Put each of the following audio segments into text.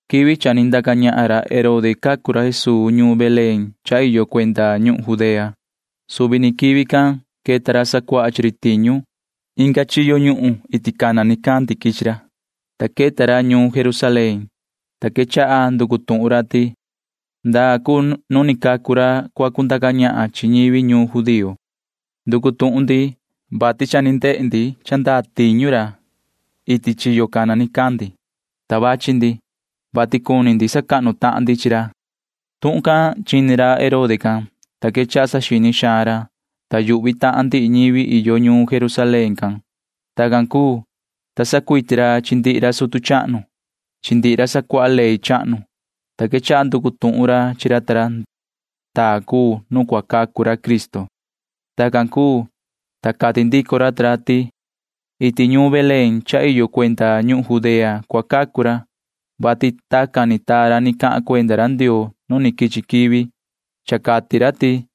Quivi cha ni ndaca ñahan ra Herode cacu ra Jesuu ñuun Belén cha iyo cuenda ñuhun Judea. Suvi ni quivi can queta ra sacuaha chi ri tiñu. Inga ñuhun chiyo nu cana nicandi quichi ra, ta queta ra ñuun Jerusalén, ta quechaha nducu tuhun ra ti: ―¿Ndaa cuu nu ni cacu ra cuu ra cua cundaca ñahan chi ñivi judío? Nducu tuhun ndi, vati cha ni ndehe ndi cha ndaa ri cuu tiñu ra chiyo cana nicandi, ta vachi ndi, vati cuni sacahnu tahan ndi chi ra ―cati ra ta ra. Tuhun can chini ra Herode can, ta quechaha saxini xaan ra, ta yuhvi tahan ndihi ñivi iyo ñuun Jerusalén can. Tacan cuu, ta sacuiti ra chi ndihi ra sutu chahnu chi ndihi ra sacuaha ley chahnu cha sacahnu ñivi can, ta quechaha nducu tuhun ra chi ra ta ra ndaa cuu nu cua cacu ra Cristo. Tacan cuu, ta cati ndico ra ta ra ti: ―Iti ñuun Belén cha iyo cuenda ñuhun Judea cua cacu ra, vati tacan ni taa ra ni cahan cuenda ra Ndioo nu ni quichi quivi. Cha cati ra ti: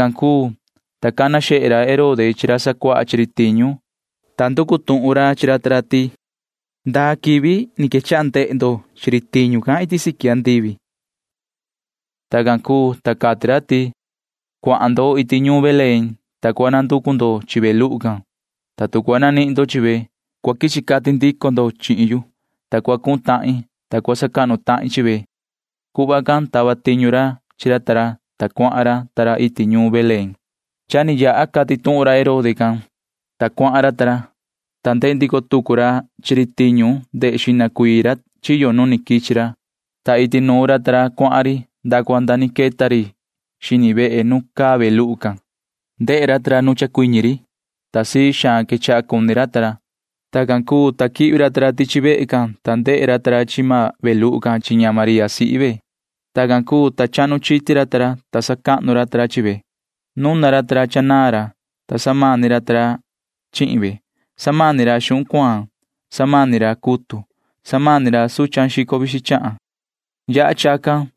Tacan cuu, ta cana xehe ra Herode chi ra sacuaha tiñu can, ta nducu tuhun ra chi ra ta ra ndaa quivi ni quechaha ndehe ra ta ra tiñu can iti siqui andivi. Tacan cuu, ta cati ra ti: ―Cuahan ndo iti ñuun Belén, ta cua nanducu vaha ndo chi ve luhu can. Tacan cua nanihin ndo chi ve, ta sa cua quichi cati ndo chihin yu, vati tacan cua cuhun tahin, ta sa cua sacahnu tahin chi ve ―cati ra. Tacan tava tiñu ra chi ra ta ra iti ñuun Belén. Chini ra ta ra cha ni cahan ra Herode can, ta cuahan ra. Ni ndehe ndico tucu ra chi ri tiñu ndehe xihna ra chiyo nu ni quichi ra, ta iti nuun ra ta ra cuahan ri nda cua nda ni queta ri xini vehe nu caa ve luhu can. Ndehe ra ta ra nu chacuiñi ri, ta sii xaan quechaha cuni ra. Tacan cuu, ta quihvi ra ta ra tichi vehe can, ta ndehe ra ta ra chi maan ve luhu can chi ña María sihi ve. Tacan cuu, ta chahnu chiti ra, ta sacahnu ra ta ra chi ve. Nuna ra ta ra cha naan ra, ta samani ra ta ra chi ve. Samani ra xuhun cuaan. Samani ra cutu. Samani ra suchan xico vixin chahan. Samani ra ta ra.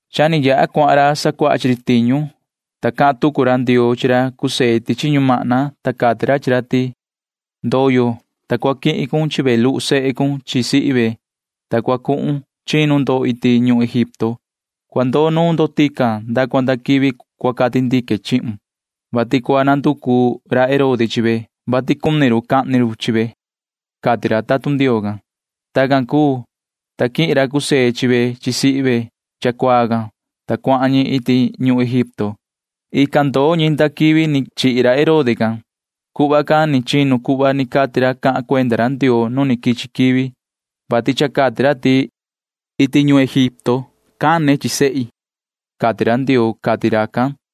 Cha cuahan ra sacuaha chi ri tiñu, ta cahan tucu ra tatun ra chahnu Ndioo chi ra José chi ñumahna, ta cati ra chi ra ti: ―Cua cuinda cun, ta cua quihun chi ve luhu sehun chi sihi ve, ta cua cunu ndo cuhun ndo iti ñuhun Egipto. Cua ndoo ndo tican nda cua nda quivi cua cati ndique chihun, vati cua nanducu ra Herode chi ve, vati cua cahni run chi ve ―cati ra tatun Ndioo can. Tacan cuu, ta quihin ra José chi ve chi sihi ve cha cuaa can, ta cuahan ñi iti ñuhun Egipto. Ican ndoo ñi nda quivi ni chihi ra Herode can. Chacan cuu cha queta tuhun ra chahnu Ndioo cuhva ni cati ra cahan cuenda ra Ndioo nu ni quichi quivi, vati cha cati ra ti iti ñuhun Egipto cana ra chi sehe ra, cati ra Ndioo ―cati racan.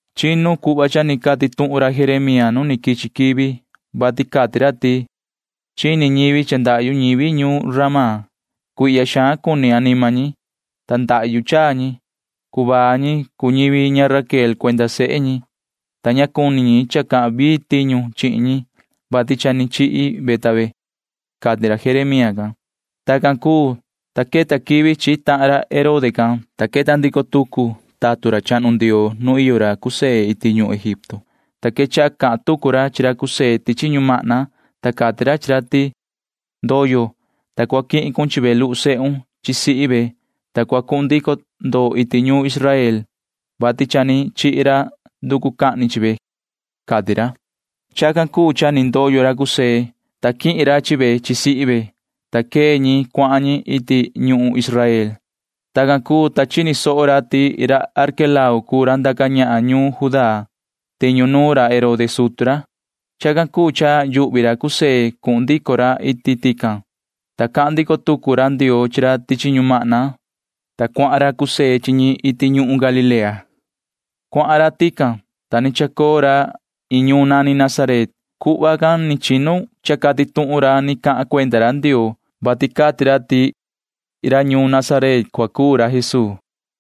Tacan queta tuhun cha ni cati ra Jeremía nu ni quichi quivi, vati cati ra ti: Chini ñivi ti ndahyu ñivi ñuun Ramá. Cuihya xaan cuni anima ñi, ta ndahyu chaa ñi. Cuvaa ñivi cuu ñivi ña Raquel cuenda sehe ñi, ta ña cuni ñi cha cua cava taxin anima ñi, vati cha ni chihi ve, cati ra Jeremía can. Tacan cuu, ta queta quivi chihi tahan ra Herode can, ta queta ndico tucu tatun ra chahnu Ndioo nu iyo ra José iti ñuhun Egipto can, ta quechaha cahan tucu ra chi ra José tichi ñumahna, ta cati ra chi ra ti: ―Cua cuinda cun, ta cua quihun chi ve luhu sehun chi sihi ve, ta cua cuhun ndico ndo iti ñuhun Israel, vati cha ni chihi ra nducu cahni chi ve ―cati ra. Chacan cuu cha ni chacuinda ra José, ta quihin ra chi ve chi sihi ve, ta quee ñi cuahan ñi iti ñuhun Israel. Tacan cuu, ta chini soho ra ti ra Arquelao cuu ra ndiso tiñu ra Herode sutu ra, ta ndaca ñahan ra iti ñuhun Judea can. Chacan cuu cha yuhvi ra José cuhun ndico ra tican. Cahan ndico tucu ra Ndioo chi ra tichi ñumahna, ta cuahan ra José chi ñi iti ñuhun Galilea. Cuahan ra tican, ta ni chacoo ra iin ñuun nani Nazaret. Chacan cuu cha queta tuhun cahan ra ni cahan cuenda ra Ndioo, vati cati ra ti ra ñuun Nazaret cua cuu ra Jesuu.